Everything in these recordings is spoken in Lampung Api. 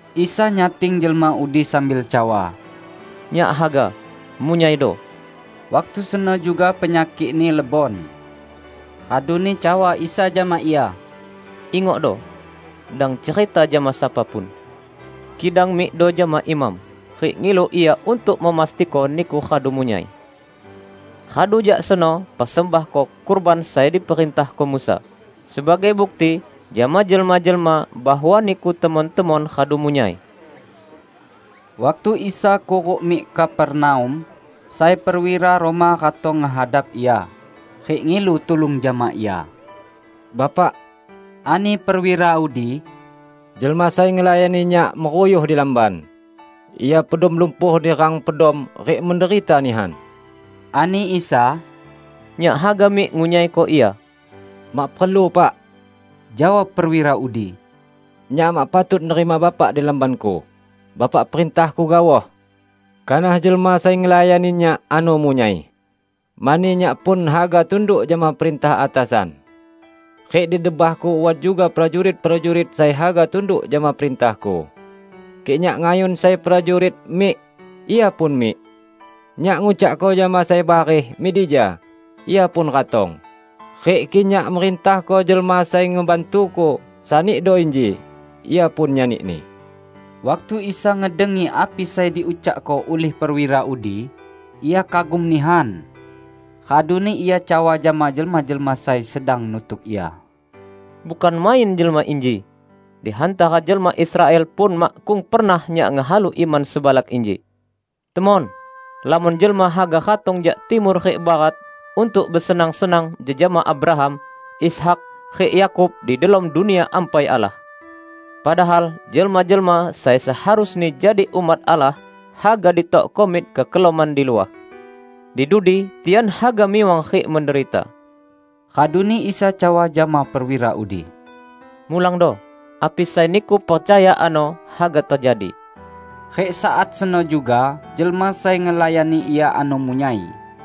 Isa nyating jelma udi sambil cawa, "Nyak haga. Munyaido!" Waktu seno juga penyakikni lebon. Raduni cawa Isa jama ia, "Ingokdo! Dang cerita jama sapa pun. Kidang mikdo jama imam, rik ngilu ia untuk memastiko niku radu munyai. Radu jak seno persembahko kurban sai diperintahko Musa, sebagai bukti jama jelma-jelma bahwa niku temon-temon radu munyai!" Waktu Isa kuruk mik Kapernaum, sai perwira Roma ratong ngehadap Ia, rik ngilu tulung jama Ia. "Bapak," ani perwira udi, "jelma sai ngelayani nyak meruyuh di lamban. Ia pedom lumpuh di rang pedom rik menderita nihan." Ani Isa, "Nyak haga mik ngunyaiko ia." "Mak perlu Pak," jawab perwira udi, "Nyak mak patut nerima Bapak di lambanku. Bapak perintahko gaoh. Kanah jelma sai ngelayani nyak ano munyai. Mani nyak pun haga tunduk jama perintah atasan. Rik di debahku wat juga prajurit-prajurit sai haga tunduk jama perintahku. Kik nyak ngayun sai prajurit, 'Mik!' ia pun mik. Nyak ngucakko jama sai bareh, 'Mik dija!' ia pun ratong; rik kik nyak merintahko jelma sai ngebantuku, 'Sanido inji!' ia pun nyanini." Waktu Isa ngedengi api sai diucakko ulih perwira udi, Ia kagum nihan. Raduni Ia cawa jama jelma-jelma sai sedang nutuk Ia, "Bukan main jelma inji. Di hantara jelma Israel pun makkung pernah Nyak ngehalu iman sebalak inji! Temon! Lamon jelma haga ratong jak timur rik barat untuk besenang-senang jejama Abraham, Ishak, rik Yakub di delom Dunia Ampai Allah. Padahal jelma-jelma sai seharusni jadi umat Allah haga ditokko mik kekelaman di luah. Di dudi tian haga miwang rik menderita." Raduni Isa cawa jama perwira udi, "Mulangdo, api sai niku percaya ano haga tejadi." Rik saat seno juga jelma sai ngelayani ia ano munyai.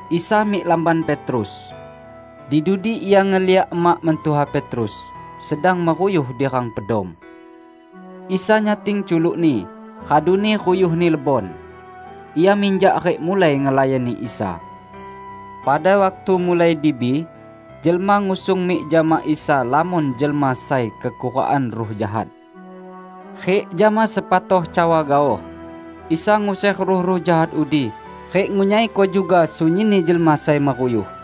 Isa mik lamban Petrus. Di dudi Ia ngeliak emak mentuha Petrus sedang meruyuh di rang pedom. Isa nyating culukni, raduni ruyuhni lebon. Ia minjak rik mulai ngelayani Isa. Pada waktu mulai dibi, jelma ngusung mik jama Isa lamon jelma sai kekurukan ruh jahat. Rik jama sepatoh cawa gaoh, Isa nguser ruh-ruh jahat udi rik ngunyaiko juga sunyinni jelma sai meruyuh.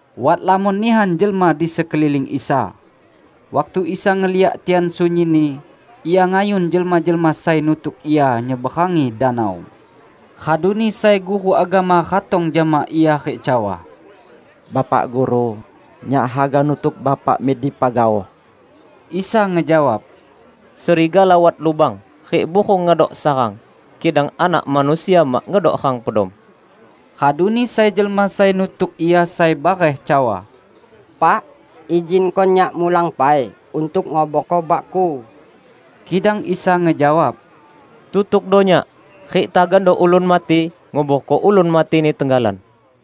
Wat lamon nihan jelma di sekeliling Isa. Waktu Isa ngeliak tian sunyinni, Ia ngayun jelma-jelma sai nutuk Ia nyeberangi danau. Raduni sai guru agama ratong jama Ia rik cawa, "Bapak Guru, nyak haga nutuk Bapa mik dipa gaoh!" Isa ngejawab, "Serigala wat lubang, rik burung ngedok sarang, kidang Anak Manusia mak ngedok rang pedom." Raduni sai jelma sai nutuk Ia sai bareh cawa, "Pak, izinko nyak mulang pai untuk nguborko bakku." Kidang Isa ngejawab, "Tutukdo Nyak, rik tagando ulun mati nguborko ulun matini tenggalan."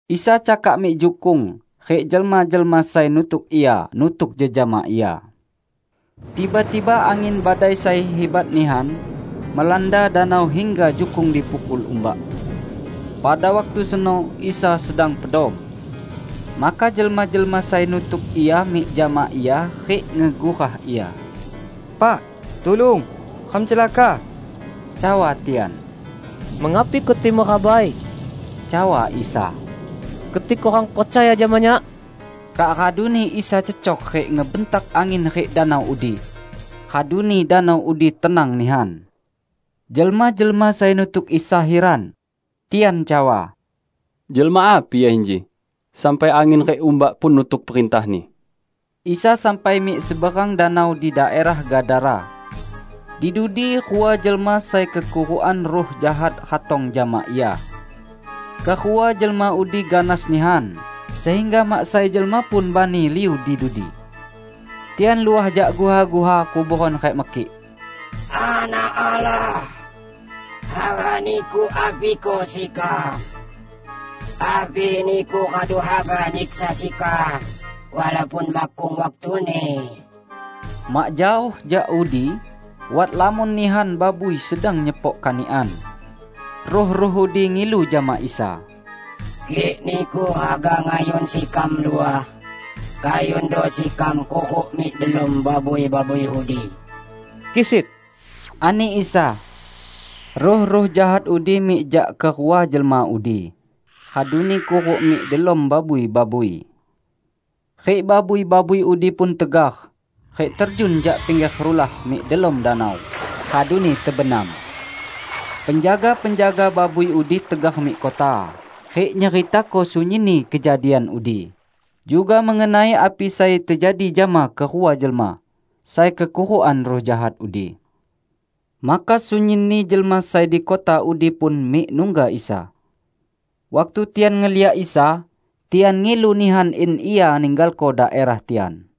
Isa cakak mik jukung rik jelma-jelma sai nutuk Ia nutuk jejama Ia. Tiba-tiba angin badai sai hibat nihan melanda danau hingga jukung dipukul umbak. Pada waktu seno Isa sedang pedom. Maka jelma-jelma sai nutuk Ia mik jama Ia rik ngegurah Ia. "Pak! Tulung! Ram celaka!" cawa tian. "Mengapi keti merabai?" cawa Isa. "Keti kurang percaya jama Nyak!" Kak raduni Isa cecok rik ngebentak angin rik danau udi. Raduni danau udi tenang nihan. Jelma-jelma sai nutuk Isa hiran. Tian cawa, "Jelma api Ia inji, sampai angin rik umbak pun nutuk perintah-Ni!" Isa sampai mik seberang danau di daerah Gadara. Di dudi rua jelma sai kekurukan ruh jahat ratong jama Ia. Kerua jelma udi ganas nihan, sehingga mak sai jelma pun bani liu di dudi. Tian luah jak guha-guha kuboran rik mekik, "Anak Allah, haga Niku apiko sekam? Api Niku radu haga nyiksa sekam walaupun makkung waktuni?" Mak jaoh jak udi, wat lamon nihan babui sedang nyepok kanikan. Ruh-ruh udi ngilu jama Isa, "Kik Niku haga ngayun sekam luah, kayundo sekam kuruk mik delom babui-babui udi." "Kisit!" ani Isa. Ruh-ruh jahat udi mik jak kerua jelma udi, raduni kuruk mik delom babui-babui. Rik babui-babui udi pun tegar rik terjun jak pingger rulah mik delom danau, raduni tebenam. Penjaga-penjaga babui udi tegar mik kota, rik nyeritako sunyinni kejadian udi, juga mengenai api sai tejadi jama kerua jelma sai kekurukan ruh jahat udi. Maka sunyinni jelma sai di kota udi pun mik nungga Isa. Waktu tian ngeliak Isa, tian ngilu nihan in Ia ninggalko daerah tian.